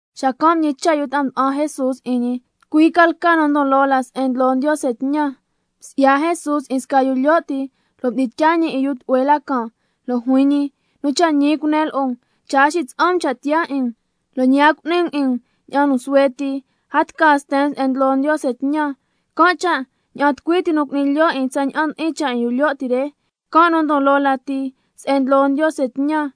Xacan' mñicha' yu ta'a nda'an Jesús 'in ñi: ¿Tucui ca lca nu ndon loo la se'en ndlo Ndiose tñan? Msi'ya Jesús 'in sca yu lyo' ti, lo' mdi'in tyaa ñi 'in yu tlu'hue la can', lo' juin ñi: Nu cha' ñi cunen lo'o um, cha' a xitsa'an um cha' tiyaa 'in um, lo' ñi a cu'ni um 'in um ña'an nu suhue ti, a tca sten um se'en ndlo Ndiose tñan. Can' cha' ña'an tucui ti nu cu'ni lyo' 'in tsaña'an ndi'in cha' 'in yu lyo' ti re, can' nu ndon loo lati se'en ndlo Ndiose tñan.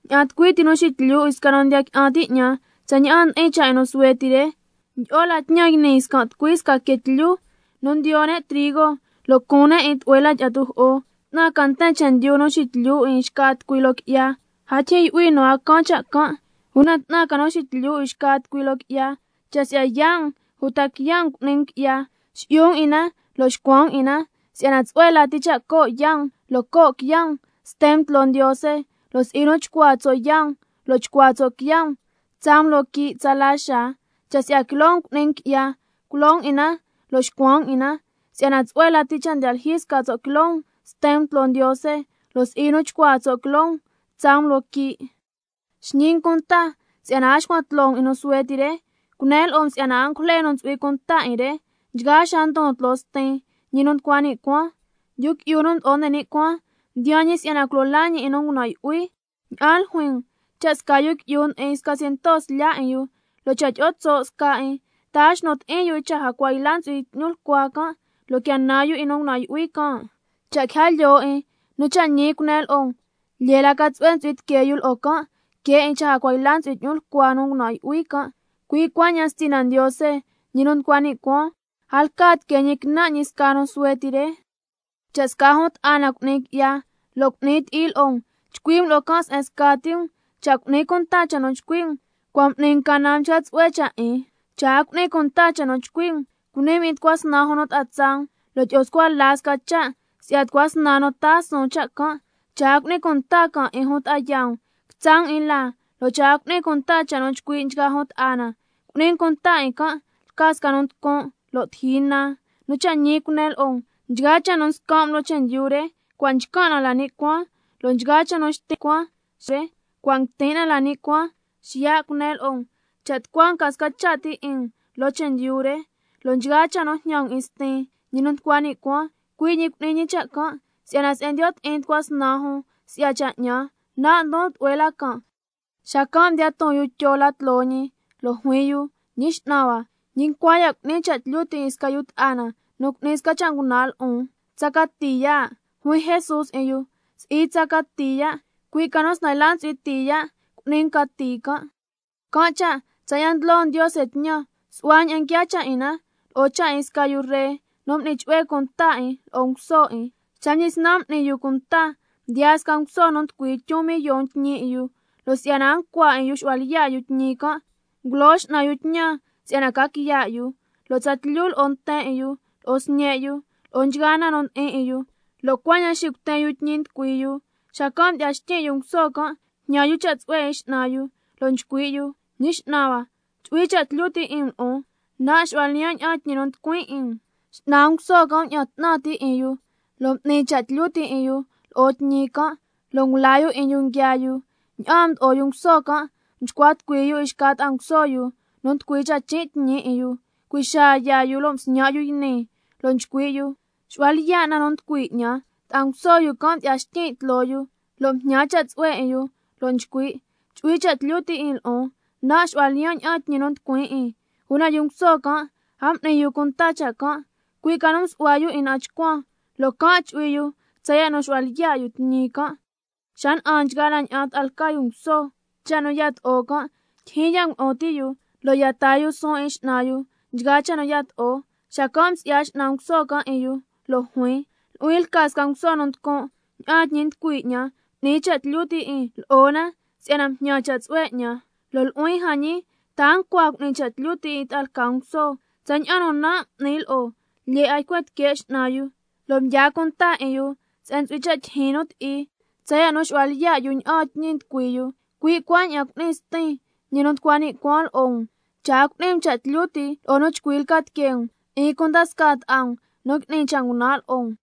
Ña'an tucui ti nu xityu 'in sca nu ndiya qui'an ti' 'ñan, tsaña'an ndi'in cha' 'in nu suhue ti re, ndyi'o la tñan yni can' scan' tucui sca quee tlyu nu ndiyo ne' trigo, lo' cuun ne' 'in tlu'hue la tyi'a tujo'o. ¡'Tnan ca nten chendyu nu xityu 'in xca tucui loo qui'ya! A ndyijyin yu'hui nu a caan cha' can'. ¡Una 'tnan ca nu xityu 'in xca tucui loo qui'ya! Cha' si'ya yaa' um uta quiya' um cu'ni um qui'ya, si'yu um 'in na lo' xcuan um 'in na, si'yana tsu'hue lati cha' co' yaa' um lo' co' quiya' um sten um tloo Ndiose, lo' si'i nu chcuaa tso' yaa' um lo' chcuaa tso' quiya' um tsaa um loo quii' tsala xaa. Cha' si'ya quiloo um cu'ni um qui'ya, culo um 'in na lo' xcuan um 'in na, si'yana tsu'hue lati cha' sca tso' ti quiloo um sten um tloo Ndiose, lo' si'i nu chcuaa tso' quiloo um tsaa um loo quii'. Xñi um cunta si'yana a xcuan tloo um 'in nu suhue ti re, cunen lo'o um si'yana angujle nu ntsu'hui cunta 'in re, nchgaa xaa ndon tloo Stin, ñi nu nducua ni' cuaan. Yu Qui'yu nu Mdo'o nde ni' Cuaan mdiyaan ñi si'yana culo laa ñi 'in nu ngunan' yu'hui. ¿Ña'an ljuin um? Cha' sca yu qui'yu ndi'in sca ciento slya' 'in yu, lo' cha' tyi'o tso' sca 'in, ¿ta a xnu ti'in yu 'in cha jacua yla ntsu'hui 'tñulcua nu can', lo' quia nan yu 'in nu ngunan' yu'hui can'? Cha' quija lyoo 'in, nu cha' ñi cunen lo'o um, lyee la ca tsu'hue chu'hui tiquee yu lo'o can', que 'in cha jacua yla ntsu'hui 'tñulcua nu a ngunan' yu'hui can'. Cui' cuaña'an Stina Ndiose, ñi nu nducua ni' cuaan, a lca tiquee ñi quinan' ñi sca nu suhue ti re. Cha' sca jun ta'a na cu'ni qui'ya lo' cu'ni ti'i lo'o um, chcui' um lo'o can' se'en scati um, cha' cu'ni cunta cha' nu chcui' um, cua' m'ni um canan mchca tsu'hue cha' 'in. Cha' a cu'ni cunta cha' chcui' um, cuni um tucua snan jun ta'a tsaa um, —lo' tyi'o scua la sca cha' si'ya tucua snan nu taa suun cha' can'—. Cha' a cu'ni cunta can' 'in jun ta'a yaa um, quitsa' um 'in laa, lo' cha' a cu'ni cunta cha' nu chcui' nchgaa jun ta'a na, cu'ni um cunta 'in can' lca sca nu nducun' lo' tiji nan. Nu cha' ñi cunen lo'o um, nchgaa cha' nu scan' um loo chendyu re, cua' nchcan' na la ni' cuaan, lo' nchgaa cha' nu xtin' um loo chendyu re, cua' nguitin' na la ni' cuaan. Xiya' cunen lo'o um, cha' tucua um ca sca cha' ti 'in um loo chendyu re, lo' nchgaa cha' nu jñan um 'in Stin, ñi nu nducua ni' cuaan, cui' ñi cu'ni ñi cha' can'. Si'yana se'en ndiyo' ti'in tucua snan jun si'ya cha' 'ñan, nan' ndon tlu'hue la can'. Xacan' mdiyaa yu Tyo la tloo ñi, lo' juin yu: Ñi X'nan hua, ¿ñi ncua ya' cu'nin cha' tlyu ti' 'in sca yu ta'a na nu cu'ni sca cha' ngunan' lo'on? ¿Tsa cati ya'? Juin Jesús 'in yu: Si'i tsa cati ya', cui' ca nu snan yla ntsu'hui tii ya' cu'ni um cati can'. Can' cha' tsaña'an ndlo Ndiose tñan, su'hua ña'an nguiaa cha' 'in na lo'o cha' 'in sca yu ree nu m'ni chu'hue cunta 'in lo'o nguso 'in. Xa mdyisnan m'ni yu cunta, mdiyaa sca nguso nu nducui tyun millon tñi 'in yu. Lo' si'yana a ncua 'in yu xu'hua lyiya' yu tni' can', ngulo x'nan yu tñan si'yana ca quiya' yu, tsatlyu lo'o nten 'in yu lo'o sñe' yu lo'o nchgaa na nu ndi'in 'in yu, lo' cuaña'an xicuten yu tñi nducui yu. Xacan' mdyi'ya xtyin' yu nguso can', mjñan yu cha' tsu'hue 'in x'nan yu, lo' nchcui' yu: Ñi x'nan hua, chu'hui cha' tlyu ti' 'in um lo'on, nan' xu'hua lyiyan' ña'aan tñi nu nducuin 'in um. X'nan nguso can' mña'an 'tnan ti' 'in yu, lo' m'ni cha' tlyu ti' 'in yu lo'o tñi can', lo' ngulaa 'in yu nguiaa yu. Ña'aan mdo'o yu nguso can', mchcua tucui yu 'in xca ta'a nguso yu nu nducui tsachin' tñi 'in yu, cui' xaa yaa yu lo' msñan' yu yni, lo' nchcui' yu: Xu'hua lyiya' na nu nducui 'ñan. Ta'a nguso yu can' mdyi'ya xtyin' tloo yu, lo' mjñan cha' tsu'hue 'in yu, lo' nchcui': Chu'hui cha' tlyu ti' 'in lo'on, nan' xu'hua lyiyan' ña'aan tñi nu nducuin 'in. Una yu nguso can' a m'ni yu cunta cha' can', cui' ca nu msu'hua yu 'in na'an chcuan, lo' can' chu'hui yu tsaya' nu xu'hua lyiya' tñi can'. Xa na'an nchgaa la ña'an ta'a lca yu nguso cha' nu yato'o, ndyijyin ya' ngulu'un ti' yu, lo' ya taa yu suun 'in x'nan yu nchgaa cha' nu yato'o. Xacan' msi'ya x'nan nguso can' 'in yu lo' juin: Nu'huin lca sca nguso nu nducun', ña'aan tñi nducui 'ñan m'ni cha' tlyu ti' 'in lo'o na, si'yana mjñan cha' tsu'hue 'ñan. Lo' nu'huin jan ñi, ¿ta a ncua cu'ni cha' tlyu ti' 'in ta'a lca nguso, tsaña'an nu nan' m'nin lo'o? Lyee 'a ycuen tique' x'nan yu, lo' mdyaa cunta 'in yu se'en nu ntsu'hui cha' tyijyin nu ti'i, tsaya' nu xu'hua lyiya' yu ña'aan tñi nducui yu. Cui' cuaña'an cu'ni Stin, ñi nu nducua ni' cuaan lo'o um, cha' a cu'ni um cha' tlyu ti' lo'o nu chcui lca tiquee um, 'in cunda scaa ta'a um nu ngui'ni cha' ngunan' lo'o um.